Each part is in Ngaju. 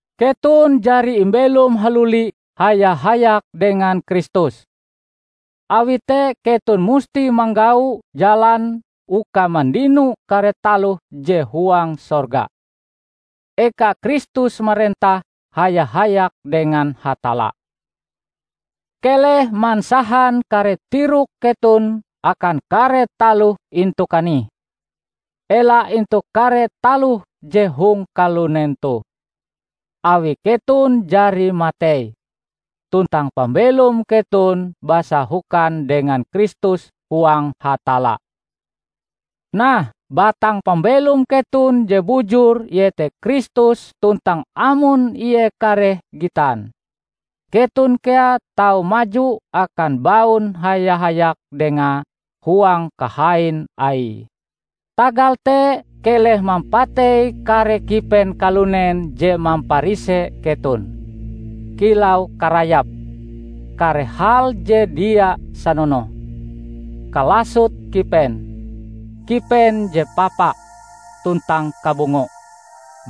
Keton jari imbelom haluli haya-hayak dengan Kristus. Awi te keton musti manggau jalan uka mandino kare taloh je huang sorga, eka Kristus marentah haya-hayak dengan Hatalla. Keleh mansahan kare tirok keton akan kare taloh intu kanih, ela intu kare taloh je hong kalunen toh. Awi keton jari matei, tuntang pambelom keton basahokan dengan Kristus huang Hatalla. Nah, batang pambelom keton je bujur iete Kristus tuntang amon Ie kareh gitan, keton kea tau maju akan baun haya-hayak Dengae huang kahain Aie! Tagal te, keleh mampatei kare kipen kalunen je mamparise keton, kilau karayap, kare hal je dia sanonoh, kalasot kipen, kipen je papa, tuntang kabungo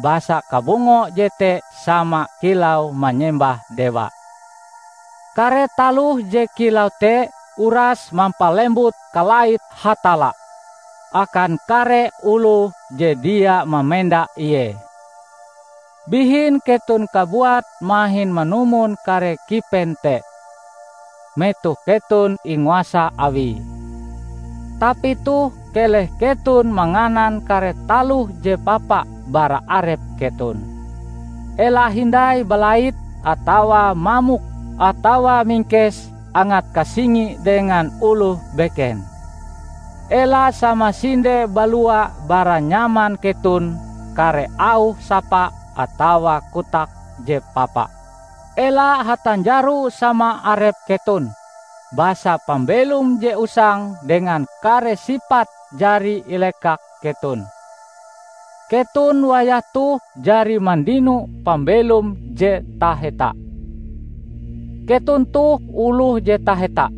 (basa kabungo jete sama kilau manyembah dewa). Kare taloh je kilau te uras mampalembut kalait Hatalla akan kare oloh je dia mamenda Ie. Bihin keton kabuat mahin manumon kare kipen te, metoh keton inguasa Awie. Tapi toh keleh keton manganan kare taloh je papa bara arep keton: ela hindai balait atawa mamok atawa mingkes angat kasingi dengan oloh beken. Ela samasinde balua bara nyaman keton kare auh sapa atawa kotak je papa. Ela hatanjaro sama arep keton, basa pambelom je usang dengan kare sipate jari ilekak keton. Keton wayah toh jari mandino pambelom je taheta. Keton toh oloh je taheta,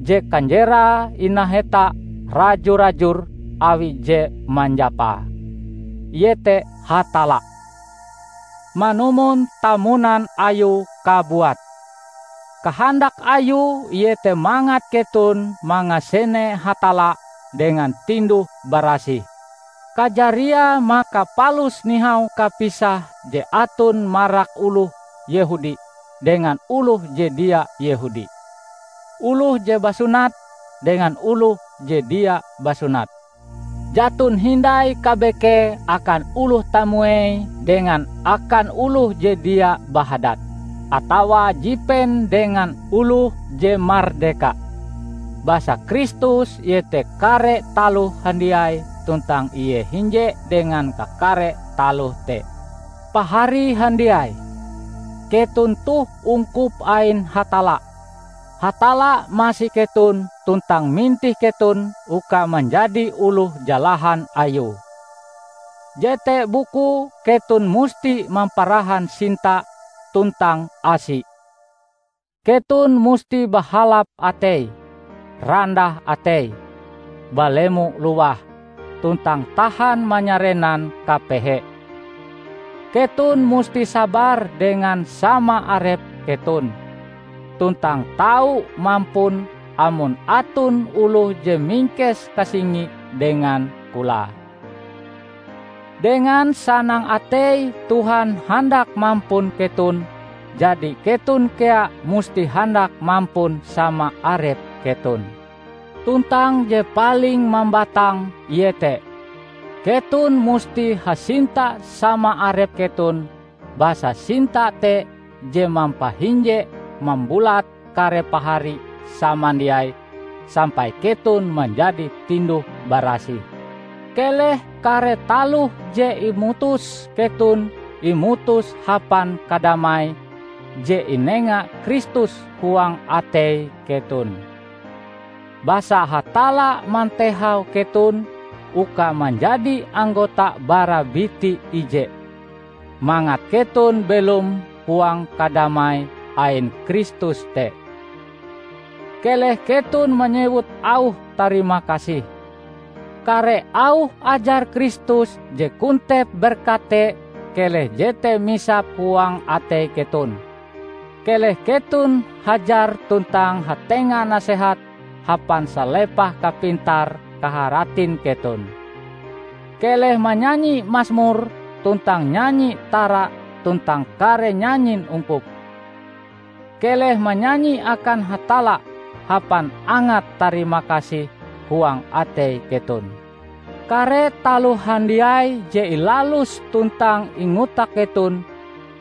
je kanjerae inaheta raju-rajur awi je manjapae, iete Hatalla, manumon tamunan Ayue kabuat. Kahandak Ayue iete mangat keton mangasene Hatalla dengan tinduh-barasih. Kajariae maka palus nihau kapisah je aton marak oloh Yehudi dengan oloh je dia Yehudi, oloh je basunat, dengan oloh je dia basunat; jaton hindai kabekee akan oloh tamuei dengan akan oloh je dia bahadat, atawa jipen dengan oloh je mardeka, basa Kristus iete kare taloh handiai tuntang Ie hinje dengan kakare taloh te! Pahari handiai, keton toh ungkup ain Hatalla. Hatalla masi keton tuntang mintih keton uka manjadi oloh jalahan Ayue. Jete bukue keton musti mamparahan sinta tuntang asi, keton musti bahalap atei, randah atei, balemo-lowah, tuntang tahan manyarenan kapehe. Keton musti sabar dengan sama arep keton, tuntang tau mampun amon aton oloh je mingkes kasingi dengan kolae. Dengan sanang atei Tuhan handak mampun keton, jadi keton kea musti handak mampun sama arep keton. Tuntang je paling mambatang iete: keton musti hasinta sama arep keton basa sinta te je mampahinje-mambulat kare pahari samandiai sampai keton manjadi tinduh-barasih. Keleh kare taloh je imutus keton imutus hapan kadamai je inenga Kristus huang atei keton. Basa Hatalla mantehau keton uka manjadi anggota bara biti ije, mangat keton belom huang kadamai ain Kristus te. Keleh keton manyewut auh tarimakasih. Kare auh ajar Kristus je kontep berkat te keleh jete misap huang atei keton. Keleh keton hajar tuntang hatenga nasehat hapan salepah kapintar-kaharatin keton. Keleh manyanyi masmur tuntang nyanyi tara tuntang kare nyanyin ungkup; keleh manyanyi akan Hatalla hapan angat tarimakasih huang atei keton. Kare taloh handiai je ilalus tuntang ingotak keton,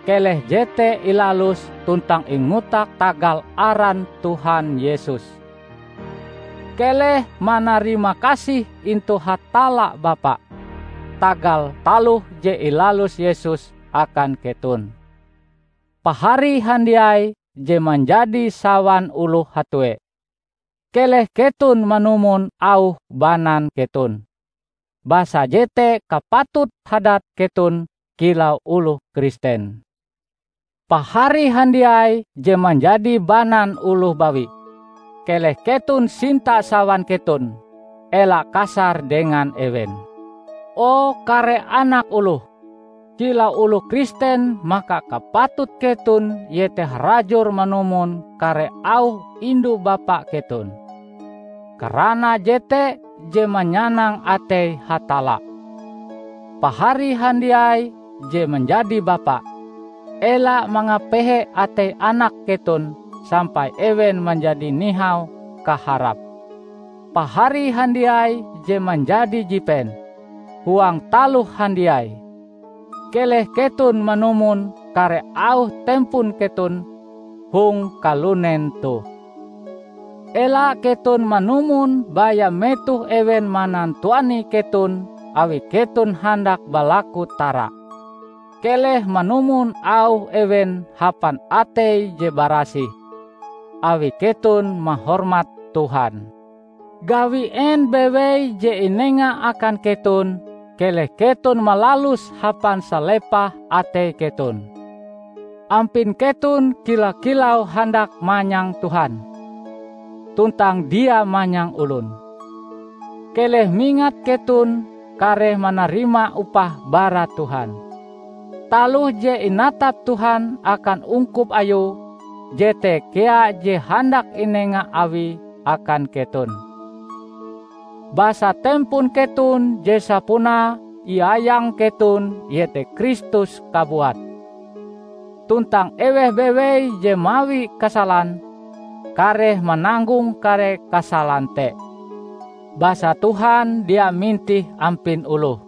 keleh jete ilalus tuntang ingotak tagal aran Tuhan Yesus. Keleh manarimakasih intu Hatalla Bapa tagal taloh je ilalus Yesus akan keton. Pahari handiai je manjadi sawan oloh hatue! Keleh keton manumon auh banan keton, basa jete kapatut hadat keton kilau oloh Kristen. Pahari handiai je manjadi banan oloh bawi! Keleh keton sinta sawan keton. Ela kasar dengan ewen. O kare anak oloh! Kilau oloh Kristen maka kapatut keton iete harajur manumon kare auh indu-bapa keton, karana jete je manyanang atei Hatalla. Pahari handiai je manjadi bapa! Ela mangapehe atei anak keton sampai ewen manjadi nihau kaharape. Pahari handiai je manjadi jipen! Huang taloh handiai, keleh keton manumon kare auh tempon keton hong kalunen toh. Ela keton manumon baya metoh ewen manantuani keton awi keton handak balaku tara. Keleh manumon auh ewen hapan atei je barasih, awi keton mahormat Tuhan. Gawi en bewei je inenga akan keton, keleh keton malaluse hapan salepah atei keton, ampin keton kila-kilau handak manyang Tuhan, tuntang dia manyang olon. Keleh mingat keton kareh manarima upah bara Tuhan. Taloh je inatap Tuhan akan ungkup Ayue, jete kea je handak inenga Awie akan keton. Basa tempon keton je sapunae iayang keton iete Kristus kabuat. Tuntang eweh bewei je mawi kasalan, kareh mananggong kare kasalan te; basa Tuhan dia mintih ampin oloh.